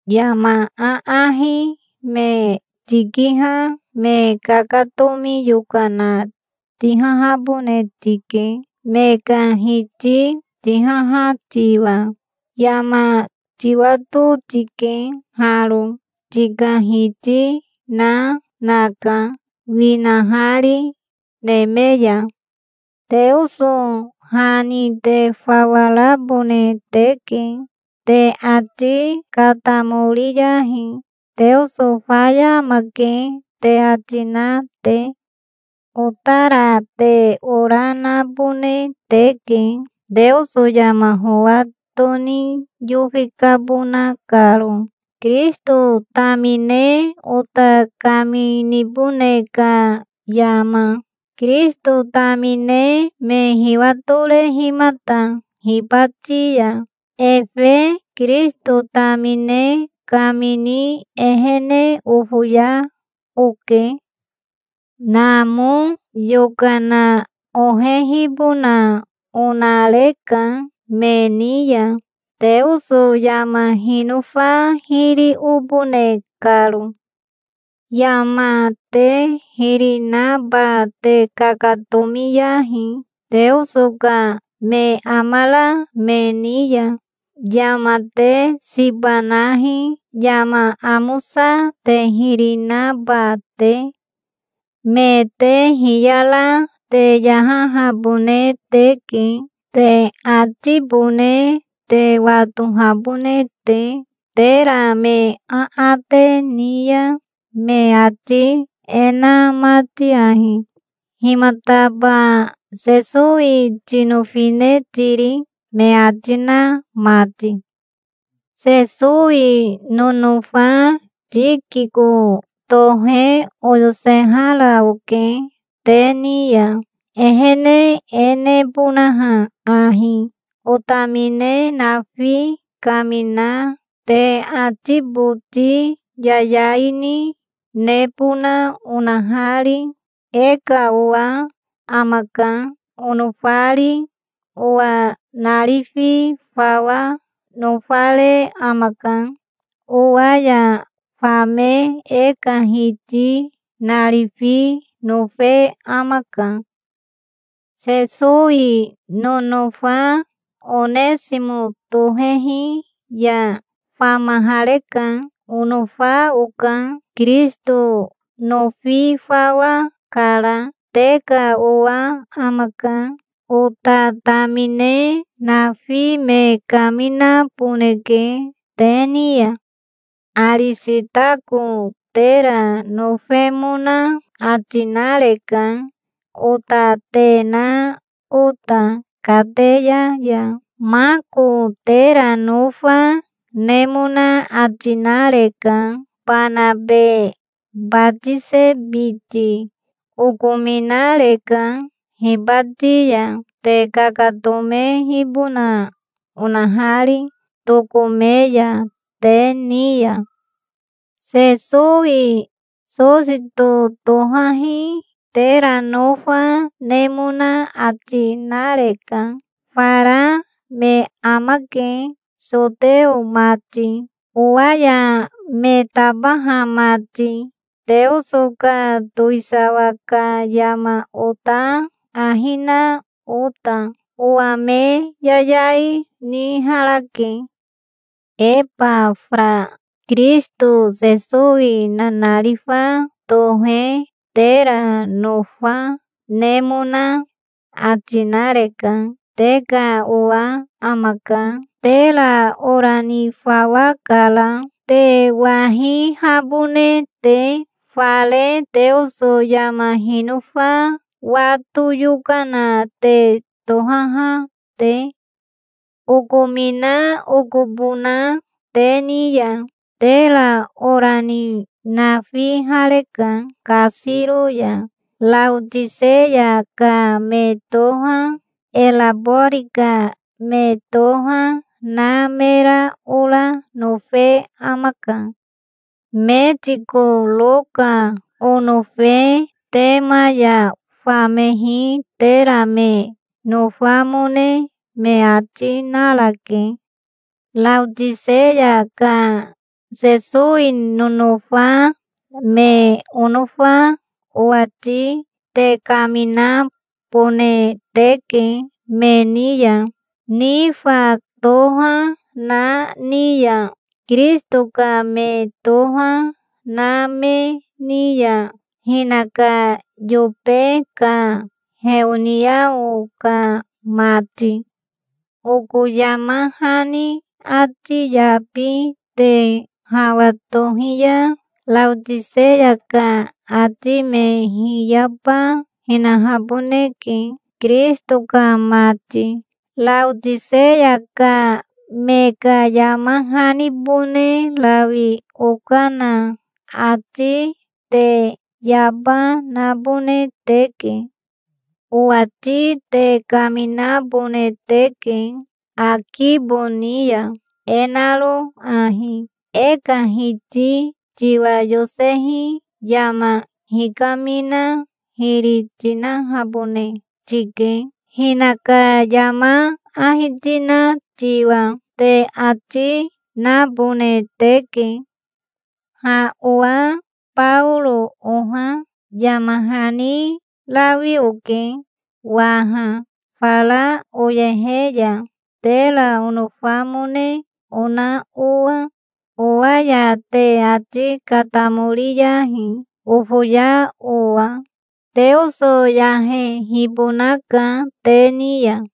Yama aahi me tikiha me kakatomi yokana tihahabone tike, me ka hiti tihaha tiwa. Yama tiwato tike haro: tika Hiti na naka, winahari neme ya. Teoso ha ni te fawa rabone teke. Te ati katamoriyahi, "Teoso faya amake", te ati na te. Otara te ora, nabone teke, Teoso yama howa toni yofi kabona karo, Kirisito tamine ota kaminibone ka yama, Kirisito tamine me hiwatorehimata hibati ya. Efe Kirisito tamine kamini ehene ofoya oke. Namo yokana ohehibona onareka me ni ya, Teoso yama hinofa hiri obone karo. Yama te hiri naba te kakatomiyahi, Teoso ka me amara me ni ya. Yama te siba nahi, yama amosa te hiri naba te. Me te hiyara te yahahabone teke, te atibone te watohabone te, tera me aate ni ya, me ati e na mati ahi, "Himataba Sesowi tinofine tiri?" me ati na mati. Sesowi nonofa Tikiko tohe oyosehara oke te ni ya, ehene e nebonaha ahi: otamine nafi kamina, te ati boti yayai ni, nebona onahari. E ka owa amaka, onofari. Owa narifi fawa nofare amaka. Owa ya fame e ka Hiti narifi nofe amaka. Sesowi nonofa Onesimo tohehi ya famahareka. Onofa, oka. Kirisito nofi fawa kara. Te ka owa amaka. Ota tamine nafi me kaminaboneke te ni ya. Arisitako tera nofemona ati nareka, ota te na ota, kateya ya. Mako tera nofa nemona ati nareka, Banabe batise biti. Okominareka hibati ya, te kakatomehibona onahari, tokome ya te ni ya. Sesowi Sosito tohahi tera nofa nemona ati nareka. Fara me amake, soteo mati, owa ya me tabaha mati, Teoso ka towisawa ka yama ota ahi na ota. Owa me yayai niharake. Ebafara Kirisito Sesowi nanarifa tohe tera nofa nemona ati nareka. Te ka owa amaka. Tera ora ni fawa kara, te wahihabone te, fare Teoso yama hinofa wato yokana te tohaha te. Okomina okobona te ni ya. Tera ora ni nafihareka kasiro ya. Raotiseya ka me toha, Erabori ka me toha, na mera ora nofe amaka. Metiko Roka onofe Tema ya famehi tera me nofamone me ati, narake. Raotiseya ka Sesowi nonofa me onofa owati te kaminabone teke me ni ya, Nifa toha na ni ya, Kirisito ka me toha na me ni ya, hinaka yobe ka heoniao ka mati. Oko yama hani ati yabi te hawa tohi ya Raotiseya ka ati me hiyaba hinahaboneke, Kirisito ka mati. Raotiseya ka me ka yama hanibone rawi okana ati te yaba nabone teke. Owati te kaminabone teke Akibo ni ya, e naro ahi: "E ka Hiti tiwa yosehi yama hikamina hiri tinahabone tike, hinaka yama ahi tina tiwa", te ati nabone teke. Ha owa Baoro oha yama hani rawi oke waha, fara oyehe ya, tera onofamone ona owa. Owa ya te ati katamoriyahi, ofoya owa. Teoso yahehibonaka te ni ya.